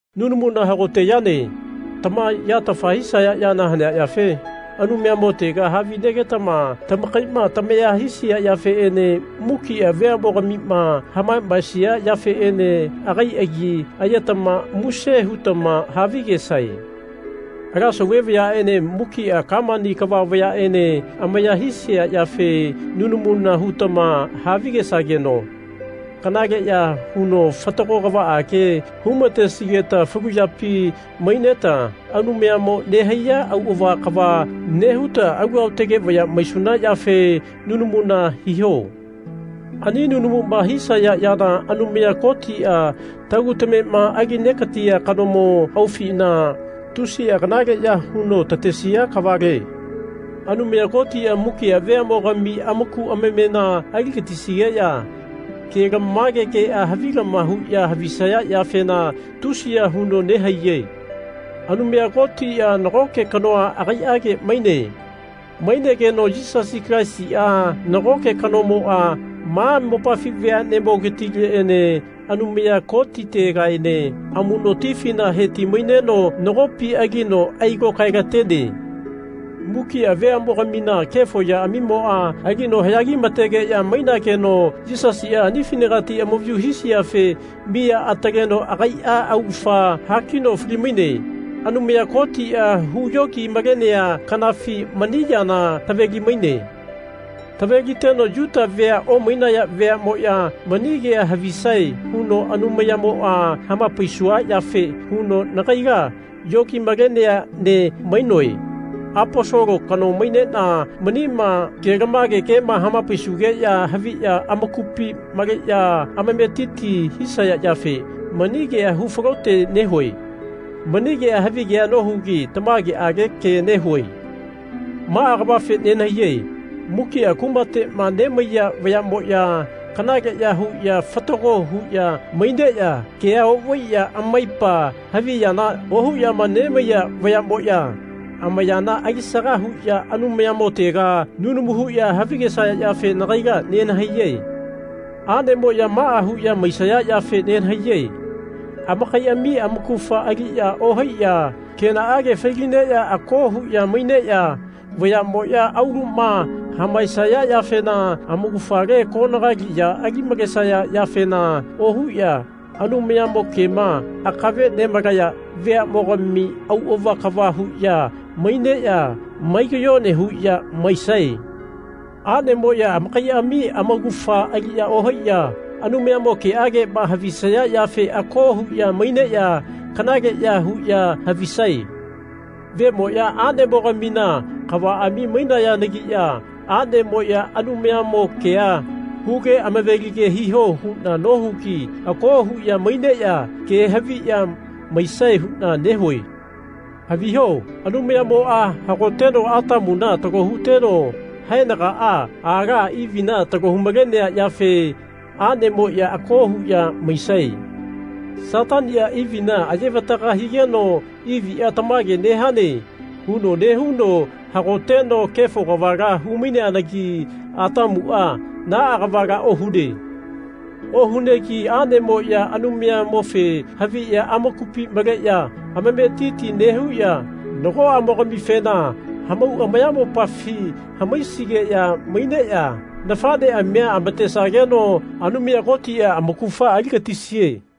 Nunamuna hagote yane. Tama yatafa hisaya yana hanea yafe Anumayamotega havinegetama tamakaima tamahaisia yafeene mukia veamogamima hamamaesia yafeene agai agi ayetama muse hutama havigesae. Ala sauve vayaene mukia kamani kava vayaene amaya hisia yafe nunamuna hutama havigesageno kanale ya huno fatago kavaage humatesigeta falu yapi maineta Anumayamo nehaiya auava kava nehuta alu aotage vaya maisuna yafe nunamuna hiho. Ani nunamuma hisaya yana Anumaya Kotia, tagu tamema ali negatia kanomo aufina tusia kanaleya huno tatesia kavale. Anumaya Kotia mukia veamogami amaku amamena aligatisigeya kelamage kea havilama huya havisaya yafena tusiya huno nehaiye. Anumaya Kotia nagoke kanoa agaiage maine. Mainegeno Yisasi Kalaisia, nagoke kanomoa ma mopafi veanemogatileene Anumaya Kotitegaene amunotifina heti-maineno nagopi alino ailokaelatene. Mukia veamogamina kefo yaamimoa alino hayagimategeya mainageno Yisasia anifinagati amavayu hisiafe miya ataleno agaia augafa hakino fali-maine. Anumaya Kotia huyogi-malenea kanafi mani yana taveli-maine. Taveliteno Yuta vea omainaya veamoya mani kea havisae huno Anumayamoa hamapaisua yafe huno nagaila yogi-malenea ne mainoe. Aposolo kano mainena manima kelamage kema hamapaisugeya haviya amakupi maleya amametiti hisaya yafe mani kea hu falote nehue. Mani kea havigea nohugi tamageage ke nehue. Maa kavafe nenahaiye mukia kumatema nemaiya vayamoya kanaleya huya fatago huya maineya kea ovaiya amaipa havi yana ohuyama nemaiya vayamoya amayana alisaga huya Anumayamotega nunamu huya havigesaya yafe nagaila nenahaiye. Anemoya maa huya maisaya yafe nenahaiye amakaiami amaugafa aliya ohaiya kenaage fai-lineya ako huya maineya vayamoya auluma hamaesaya yafena amaugafale konagali ya ali-malesaya yafena ohuya Anumayamo kema akave nemalaya veamogami auava kava huya maineya mai kayone huya maisae. Anemoya amakaiami amaugafa aliya ohaiya Anumayamo keagema havisaya yafe ako huya maineya kanaleya huya havisae. Vemoya anemogamina kavaami mainayanagiya anemoya Anumayamo kea huge amavelige hiho huna nohugi ako huya maineya ke haviya maisae huna nehue. Haviho Anumayamoa hagoteno Atamuna talo huteno haenagaa aala Ivina talo hu-malenea yafe anemoya ako huya maisae. Satania Ivina aye-vataga higeno Ivia Tamage nehane. huno nehuno hagoteno kefo kavala hu-maineanagi Atamua naa kavala ohune. Ohunegi aneyagamoya Anumayamofe haviya amakupi maleya amametiti nehuya nagoamogamifena hamau amayamopafi hamaisigeya maineya nafaneamia amatesageno Anumaya Kotia amaugafa aligatisie.